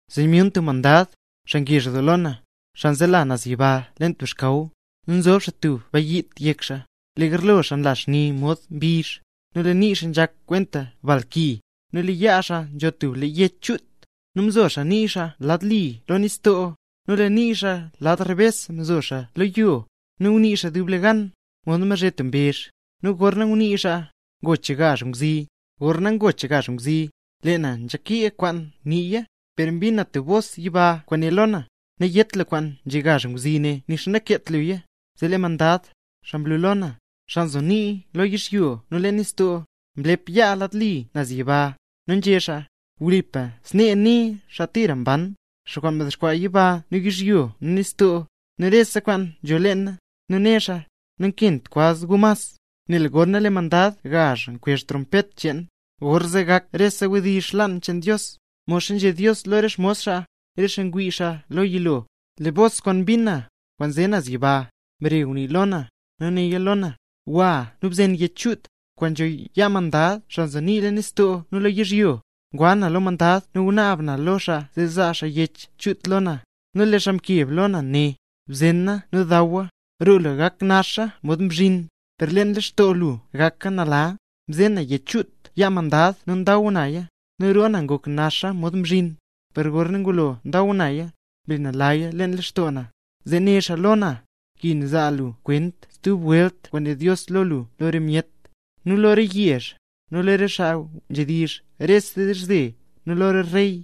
Zee myun stub mandad, xaa ngezh doo lo na, xaa nzela naz yiba leen tub xkaw. Nu nzob tub bayiit yek xaa, lee garlo xaa nla xni mod mbizh, nu lee nii xaa nzhak kwenta bal ki. Nu lee yaa xaa nzho tub lee yech chut, nu mzo xaa nii xaa lad li lo nistoo, nu lee nii xaa lad rebes mzo xaa lo yo. Nu ngunii xaa dublegan, mod mbazhe tub mbezh; nu gorna ngunii xaa, ngoch gazh ngwzi. Gorna ngulo ngoch gazh ngwzi, lee na nzhakee kwaan nguniiya; per mbin na tub bos yiba kwaan né lo na: —Nayét lu kwaan nzhé gazh ngwzi ne, nu nixa nakeet luya. Zee lee mandad, xaa mlu lo na, xaa nzo nii lo yizhyo nu leen nistoo, mlep yaa lad li naz yiba, nu nzhé xaa: —Wlipa snee né xaa kwaan tira mban, xaa kwaan mdexkwaa yiba nu yizhyo nu nistoo, nu rese kwaan nzho leena. Nu né xaa: —Nakint kwaz gu mas. Nel gorna lee mandad gazh kwezh trompet cheen, gorzee gak rese wdizh xlaan cheen Dios, modxa nzhé Dios lo re xmos xaa, re xaa ngunii xaa lo yilo. Lee bos kwaan mbin na, kwaan nze naz yiba, mbare ngunii lo na, nu néya lo na: —Gwa nu bzen yech chut, kwaan nzho yaa mandad xaa nzo nii leen nistoo nu lo yizhyo. Ngwa na lo mandad nu ngunaab na lo xaa zee zaa xaa yech chut lo na. Nu lee xaa mkeb lo na né: —Bzena nu dawa. Roo lu gak naxa mod mzhin, per lee leen lextoo lu gaka nala. Mzena na yech chut yaa mandad nu ndaw naya; nu roo na ngok naxa mod mzhin, per gorna ngulo ndaw naya, mle nalaya lextoo na. Zee né xaa lo na: —Nkin zaa lu kwent stub welt kwaan né Dios lo lu lo re myet, nu lo re yezh, nu lo re xaa nzhedizh rese dizhze, nu lo re rey.